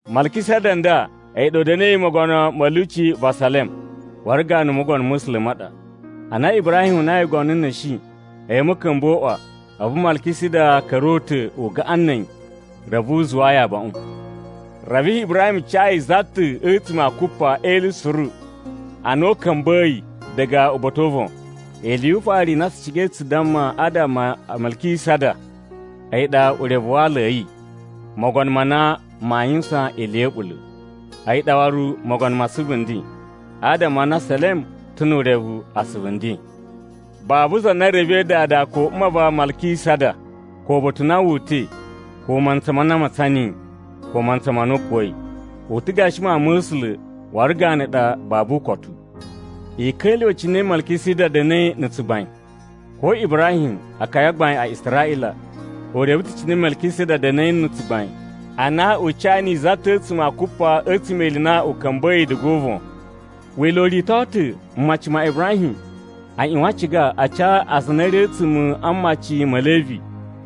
Malkisada n nda a̱yi ɗa u da̱na̱i mogono ma̱ lyuci va Salem waru ganu Mogono ma̱ A̱sula̱ ma ɗa. Ana Ibrahim unai ngono n na̱shi a̱yi a̱ ma̱ka̱mba̱a̱ o uꞌwa, a̱vu Malkisada ka̱ra̱ o uta̱ u gaꞌan na̱ a̱yi reve u zuwaa yi abaꞌun. Reve Ibrahim ca yi za ta̱ a̱tsuma̱ a kupa e ili suru a na u ka̱mba̱yi diga uba̱ta̱ o uvon. Ili yu ufaru i na tsu cigai tsu damma adama a Malkisada, a̱yi ɗa urevu wa aala a̱ yi, “mogono ma na maa yuwusan ili ya̱ a̱ɓula̱.” A̱yi ɗa waru “mogono ma asuvu nden” adama a na Salem ta̱ nu urevu “asuvu nden.” Babu za na revei dada ko mma va Malkisada, ko uba̱ta̱ u na wu uta̱i, ko mantsa ma na a matsan niyi, ko mantsa ma na u kuwa̱i. U ta̱ gashi Mawun ma̱ A̱sula̱ waru ganu ɗa babu ukotu. I ka̱lyuwa̱ cine Malkisada da̱na̱i na̱ tsugbain! Ko Ibrahim, akaya a gbain a Israꞌila, u reve ta̱ cine Malkisada da̱na̱i na̱ tsugbain ana u ca niyi za ta̱ a̱tsuma̱ a kupa a̱tsuma̱ e ili i na u ka̱mba̱yi diga o uvon. Wila̱ u rito ta̱ mmaci ma Ibrahim a ꞌyuwan a ciga a ca aza a na a̱ ri a̱tsuma̱ a mmaci ma̱ Levi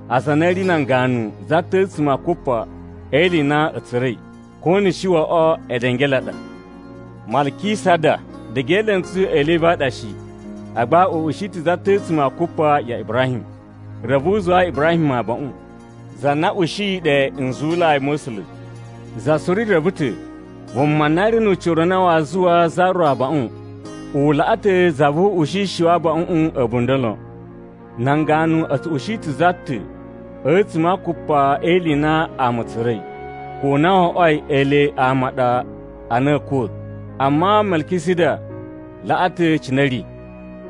aza a na a̱ ri nan ganu za ta̱ a̱tsuma̱ a kupa e ili i na a̱ tsura̱i, ko na̱ shi wo oꞌwo edenge e le a ɗa. Malkisada diga e elentsu a̱ Levi a ɗa shi, agba u ushi ta̱ za ta̱ a̱tsuma̱ a kupa ya Ibrahim. Reve u zuwaa Ibrahim abaꞌun, za na ushiyi ɗe nzuwulai ma̱ A̱sula̱. Za suru reve ta̱ vuma na ri nu ucira u na waa zuwaa za ro abaꞌun, u laꞌa ta̱ za vu u ushishi wa abaꞌuꞌun a̱bunda̱ lon. Nan ganu a̱ tsu ushi ta̱ za ta̱ a̱tsuma̱ a kupa e ili i na ama a̱ tsura̱i, ko na wo oꞌwoi ele ama a ɗa a na a̱a̱ kuwa̱. Amma Malkisada laꞌa ta̱ cine a̱ ri,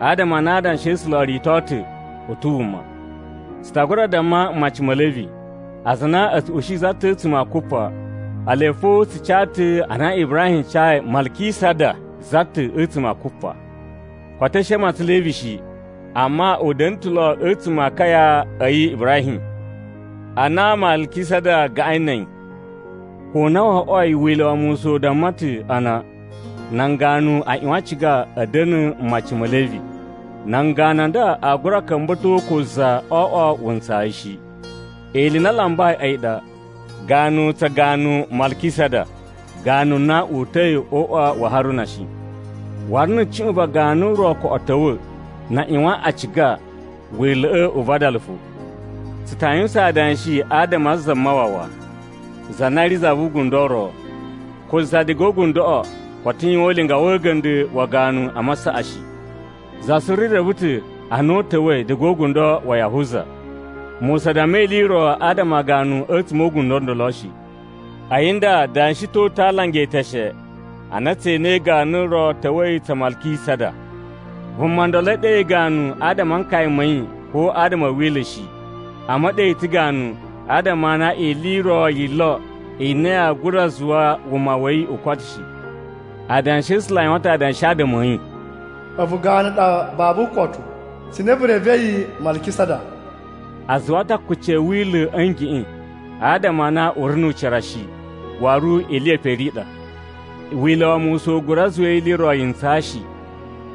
adama a na Adanshi a̱ A̱sula̱ o rito ta̱ u ta̱ wuma. Tsu ta gura damma mmaci ma̱ Levi, aza a na a̱ tsu ushi za ta̱ a̱tsuma̱ a kupa, ele fo a tsu ca ta̱ ana Ibrahim cayi Malkisada za ta̱ a̱tsuma̱ a kupa. Koto a̱ shi a matsan Levi shi, amma u da̱na̱ ta̱ lo a̱tsuma̱ a akaya a̱ yi Ibrahim, ana Malkisada gaꞌain na̱ a̱yi. Ko na wo oꞌwoi Wila̱ wa Musa u damma ta̱ a na nan ganu a ꞌyuwan a ciga a̱ da̱na̱ mmaci ma̱ Levi, nan ganu a nda aa gura ka̱mba̱to ko za o oꞌwo wuntsayi shi. Ili i na a lambai a̱yi ɗa ganu tsa ganu Malkisada, ganu na uta̱i o uꞌwa wa Haruna shi. Waru na̱ cuꞌun va ganu ro koꞌo ta̱wa̱, na a ꞌyuwan a ciga Wila̱ꞌa̱ u vadala fo. Tsu ta yuwusan adanshi adama a Zamawawa, za na ri za vu ugundo u ro. Ko za diga o ugundoꞌo koto yuwan ulinga wa̱ a̱ga̱nda̱ wa ganu a masaꞌa shi. Za suru reve ta̱ a na u ta̱wa̱i diga o ugundo wa Yahuza, Musa damma ili i ro adama a ganu a̱tsuma̱ o ugundo u ndolo shi. A̱yi nda da̱shi ta̱ uta̱ a alanga e eteshe ana tse enei ganu ro ta̱wa̱i tsa Malkisada. Vuma ndolo e ɗe yi ganu adama a nkaya ma̱ yi ko adama a̱ wila̱ shi, amma e ɗe yi ta̱ ganu adama a na ili i ro yi lo i na yaa gura zuwa wuma wa̱ yi u koto shi. Adanshi a̱ A̱sula̱ a yuwan ta̱ adanshi adama a̱ yi, “A̱vu ganu ɗa babu ukotu, cine vu revei Malkisada.” A zuwa ta̱ akuci a̱ wila̱ a̱ ngeꞌen, adama a na u ri nu ucira shi, waru ili ye pere i ɗa. Wila̱ wa Musa u gura zuwa ili i ro yi ntsaa shi.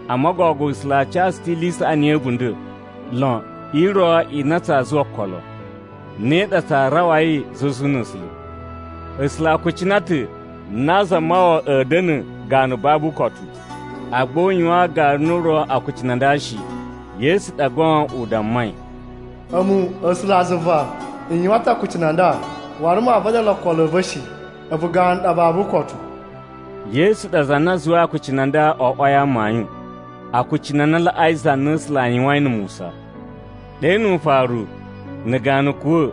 Amma gogo A̱sula̱ a ca tsu ta̱ ili i saꞌani ya̱ a̱bunda̱ lon i ro i na tsaa zuwa okolo. Ne ɗa tsaa rawai zuzu na̱ A̱sula̱. A̱sula̱ a kucina ta̱ na Zamawawa a̱a̱ da̱na̱ ganu babu ukotu, agba u yuwaan ganu ro akucunu a nda shi. Yesu ɗa goon u dammai: “A̱mu A̱sulazuva, n yuwan ta̱ akucunu a nda, waru maa vadala okolo a̱ va̱ shi. ‘A̱vu ganu ɗa babu ukotu.’” Yesu ɗa za na zuwai akucunu a nda o oꞌwoi amayun, akucunu a na laꞌai za na A̱sula̱ a yuwain na̱ Musa. Ɗe nu ufaru, na̱ ganu kuwa̱,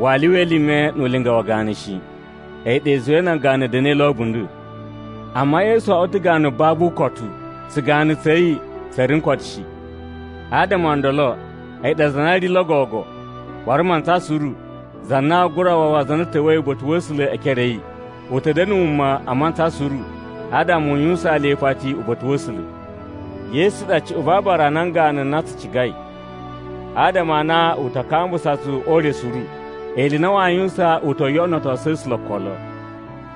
waa lyuwa elime nu ulinga wa ganu shi. A̱yi ɗa i zuwai nan ganu a̱ da̱na̱i lo a̱bunda̱. Amma Yesu oꞌwo ta̱ ganu babu ukotu, tsuganu tsa̱ yi tsa̱ ri n koto shi. Adama o ndolo, a̱yi ɗa za na ri lo gogo, waru mantsa suru, za na aa gura wawa aza a na a ta̱wa̱i uba̱ta̱ wa̱ A̱sula̱ e ekere a̱ yi. U ta̱ da̱na̱ wuma mantsa suru adama u yuwusaan le ipati uba̱ta̱ wa̱ A̱sula̱. Yesu ɗa cuꞌun va aabara a nan ganu na tsu cigai, adama a na u ta kambusa tsu o ure suru. Ili i na waa yuwusan u to yoꞌonotosu A̱sula̱ okolo.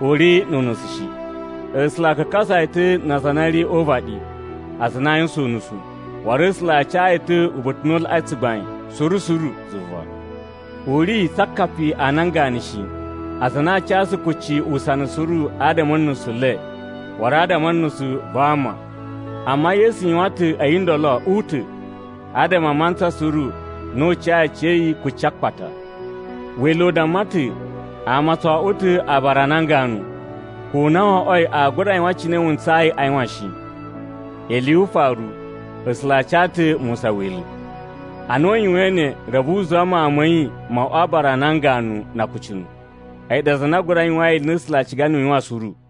U ri nu unusu shi. A̱sula̱ a kakasa yi ta̱ na aza a na a̱ ri o uvaɗi aza a na aa yuwusan unusu. Waru A̱sula̱ a ca yi ta̱ uba̱ta̱ u na u laꞌai tsugbain suru suru zuva. U ri tsa akapi a nan ganu shi, aza a na a casu kucci usana suru adama a̱ nusu le, waru adama a̱ nusu va ama. Amma Yesu yuwan ta̱ a̱yi ndolo u ta̱ adama a mantsa suru na u cayi aciya̱yi kucci a akpata. Wila̱ u damma ta̱ ama o tso oꞌwo ta̱ abara a nan ganu, ko na wo oꞌwoi aa gura yuwan cine wu ntsayi a yuwan shi. Ili yu ufaru, A̱sula̱ a ca ta̱ Musa Wila̱. Ana a yuwain ne, reve u zuwa Mawun ma̱ yi mo oꞌwo aabara a nan ganu na akucunu. A̱yi ɗa za na gura yuwain ili i na A̱sula̱ a ciga niyi u yuwan suru.